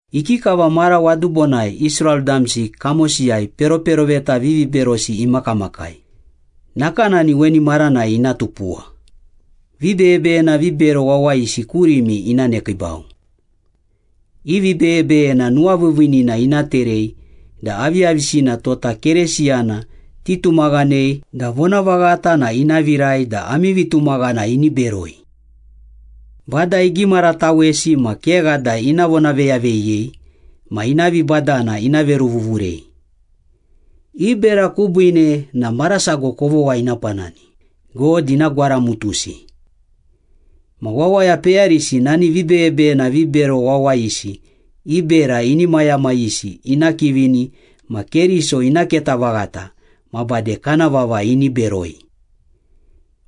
Ikikava mara wadubonai Israel damsi kamosiyai peroperoveta viviberosi imakamakai, nakanani weni maranai ina tupuwa, vibeyebeyena vibero wawayisi kurimi ina nekiibau. I vibeyebeyena nuwaviiviinina ina terei da aviyavisina tota Keresiyana titumaghanei da vonavaghata na ina virai da ami vitumaghana ini beroi. Bada igimaratawesi ma kegha da ina vonaveyaveyiyei ma ina vibadana ina veruvuvurei. I bera kubiine na marasago kovogha ina panani, God ina gwaramutusi. Ma wawaya peyarisi nani vibeyebeyena vibero wawayisi i bera inimayamayisi ina kivini ma Keriso ina keta vaghata ma bade kana vava ini beroi.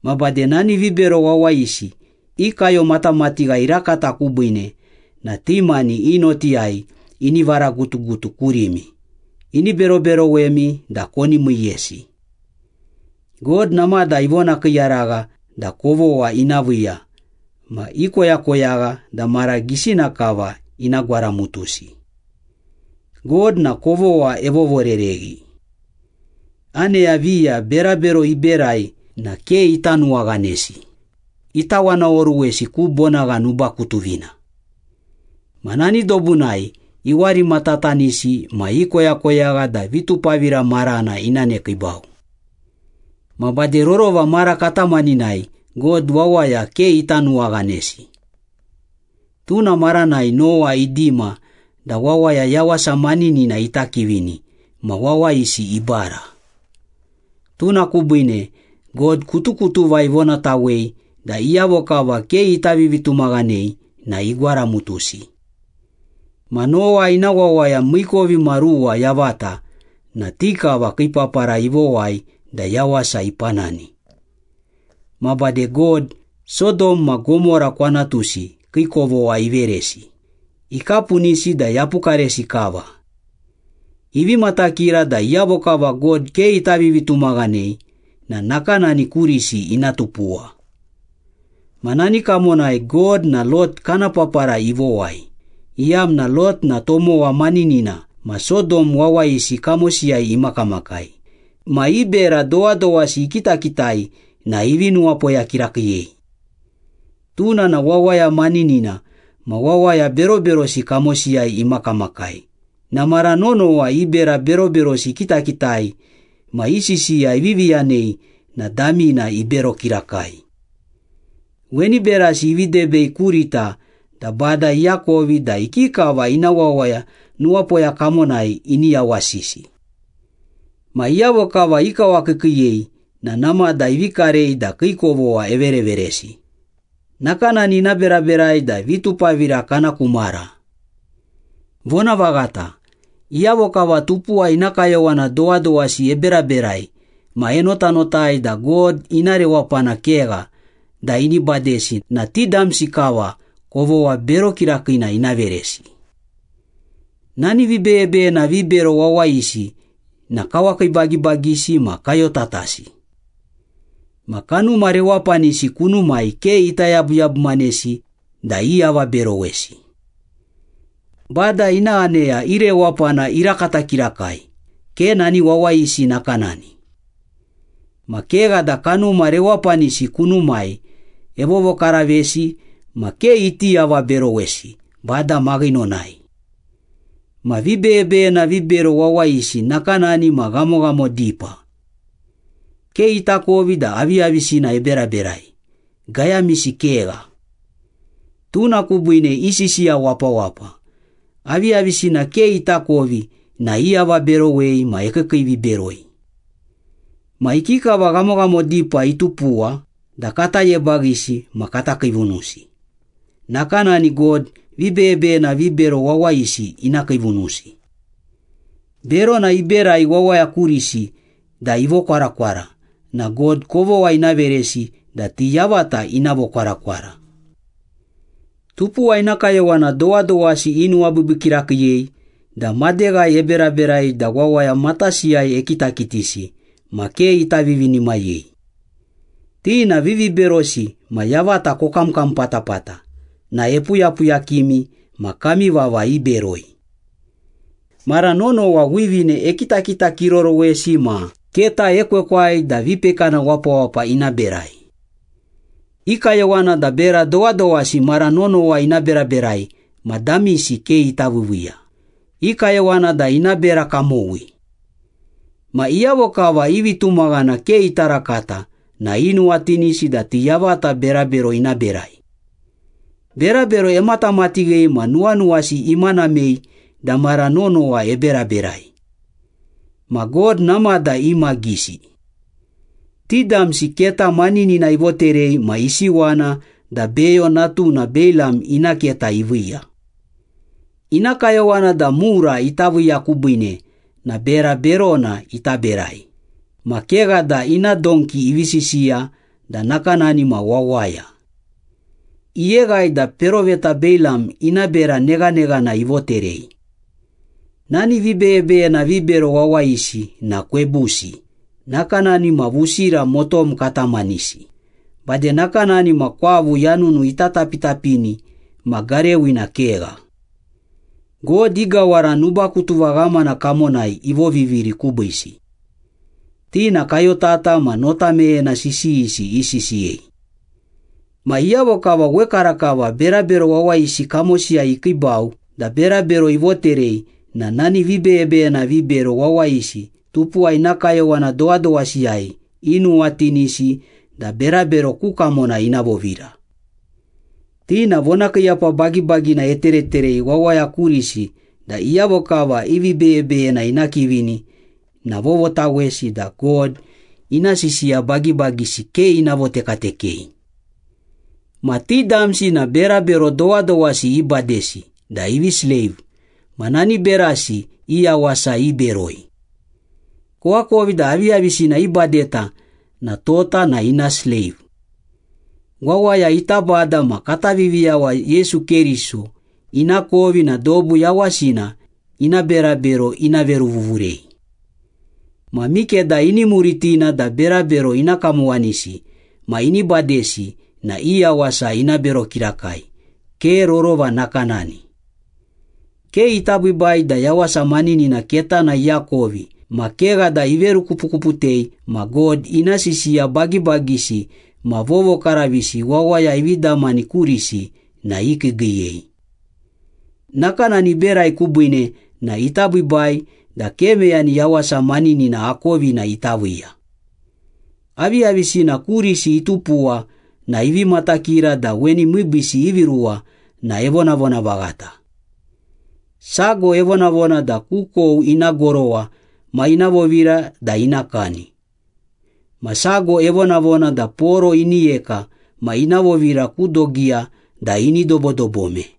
Ma bade nani vibero wawayisi i kayomatamatigha irakata kubiine na ti mani i notiyai ini varagutugutu kurimi, ini beroberowemi da koni miiyesi. God namada ivonakiiyaragha da kovogha ina viiya, ma ikoyakoyagha da mara gisina kava ina gwaramutusi. God na kovogha evovorereghi. Aneya viya berabero iberai na ke ita nuwaghanesi, itawanaoruwesi ku bonagha nubakutuvina. Ma nani dobunai iwarimatatanisi ma ikoyakoyagha da vitupavira marana ina nekiibau. Ma bade rorova mara katamaninai God wawaya ke ita nuwaghanesi. Tuna maranai Nowa idima da wawaya yawasa maninina ita kivini ma wawayisi ibara. Tuna kubiine God kutukutuva ivonatawei da iyavo kava ke ita vivitumaghanei na igwaramutusi. Ma Nowa ina wawaya miikovimaruwa yavata na ti kava kii papara ivowai da yawasa ipanani. Ma bade God, Sodom ma Gomora kwanatusi kii kovogha iveresi, ikapunisi da yapukaresi kava. Ivi matakira da iyavo kava God ke ita vivitumaghanei na nakanani kurisi ina tupuwa. Ma nani kamonai God na Lot kana papara ivowai, iyamna Lot na tomowa maninina ma Sodom wawayisi kamosiyai imakamakai ma i bera dowadowasi ikitakitai na ivi nuwapoya kirakiiyei. Tuna na wawaya maninina ma wawaya beroberosi kamosiyai imakamakai na mara nonowa i bera beroberosi ikitakitai ma i sisiya ivivi yanei na damina ibero kirakai. Weni berasi ivi debei kurita da Bada iakovi da ikikava ina wawaya nuwapoya kamonai ini yawasisi. Ma iyavo kava ikawakiikiiyei na namada ivi karei da kii kovogha evereveresi, nakanani ina beraberai da vitupavira kana ku mara. Vonavaghata, iyavo kava tupuwa ina kayowana dowadowasi eberaberai ma enotanotai da God ina rewapana kegha da ini badesi na ti damsi kava kovogha bero kirakiina ina veresi. Nani vibeyebeyena vibero wawayisi na kawakiibagibagisi ma kayotatasi. Ma kanuma rewapanisi kunumai ke ita yabuyabumanesi da iavaberowesi. Bada ina aneya i rewapana irakata kirakai, ke nani wawayisi nakanani. Ma kegha da kanuma rewapanisi kunumai evovokaravesi ma ke iti avaberowesi Bada maghinonai. Ma vibeyebeyena vibero wawayisi nakanani ma ghamoghamo dipa. Ke itakovi da aviyavisina eberaberai, gayamisi kegha. Tuna kubiine isisiya wapawapa, aviyavisina ke itakovi na iavaberowei ma ekiikiiviberoi. Ma ikikava ghamoghamo dipa itupuwa da kata yebaghisi ma kata kiivunusi, nakanani God vibeyebeyena vibero wawayisi ina kiivunusi. Berona iberai wawaya kurisi da ivokwarakwara na God kovogha ina veresi da ti yavata ina vokwarakwara. Tupuwa ina kayowana dowadowasi inuwabiibii kirakiiyei da madeghai eberaberai da wawaya matasiyai ekitakitisi ma ke ita vivinimayei. Ti na viviberosi ma yavata kokamkam patapata na epuyapuyakimi ma kami vava iberoi. Mara nonowa wivine ekitakitakirorowesi ma keta ekwekwai da vipekana wapawapa ina berai. I kayowana da bera dowadowasi mara nonowa ina beraberai ma damisi ke ita viiviiya, i kayowana da ina bera kamowi. Ma iyavo kava i vitumaghana ke ita rakata na inuwatinisi da ti yavata berabero ina berai. Berabero ematamatighei ma nuwanuwasi imanamei da mara nonowa eberaberai. Ma God namada imagisi. Ti damsi keta maninina ivoterei ma isiwana da Beyo natuna Beilam ina keta iviiya. Ina kayowana da mura ita viiya kubiine na bera berona ita berai, ma kegha da ina donki ivi sisiya da nakanani ma wawaya. Iyeghai da peroveta Beilam ina bera neghaneghana ivoterei. Nani vibeyebeyena vibero wawayisi na kwebusi, nakanani ma vusira motom katamanisi, bade nakanani ma kwavu yanunu ita tapitapini ma garewina kegha. God i gawara nubakutuva ghamana kamonai ivoviviri kubiisi. Ti na kayotata ma nota meyena sisiyisi isisiyei. Ma iyavo kava wekarakava berabero wawayisi kamosiyai ikiibau da berabero ivoterei na nani vibeyebeyena vibero wawayisi tupuwa ina kayowana dowadowasiyai inuwatinisi da berabero ku kamona ina vovira. Ti na vonakiiyapa bagibagina etereterei wawaya kurisi da iyavo kava i vibeyebeyena ina kivini na vovotawesi da God ina sisiya bagibagisi ke ina votekatekei. Ma ti damsi na berabero dowadowasi ibadesi da ivi sleiv ma nani berasi i yawasa iberoi. Koakovi da aviyavisina ibadeta na tota na ina sleiv. Wawaya ita Bada ma kata Viviyawa Yesu Keriso inakovi na dobu yawasina ina berabero ina veruvuvurei. Ma mikeda ini muritina da berabero ina kamowanisi ma ini badesi na i yawasa ina bero kirakai, ke rorova nakanani. Ke ita biibai da yawasa maninina ketana iakovi ma kegha da iverukupukuputei ma God ina sisiya bagibagisi ma vovokaravisi wawaya ivi damani kurisi na ikiigiiyei. Nakanani iberai kubiine na ita biibai da ke meyani yawasa maninina akovina ita viiya. Aviyavisina kurisi itupuwa na ivi matakira da weni miibiisi ivi ruwa na evonavona vaghata. Sago evonavona da kukou ina gorowa ma ina vovira da ina kani. Ma sago evonavona da poro ini yeka ma ina vovira ku dogiya da ini dobodobome.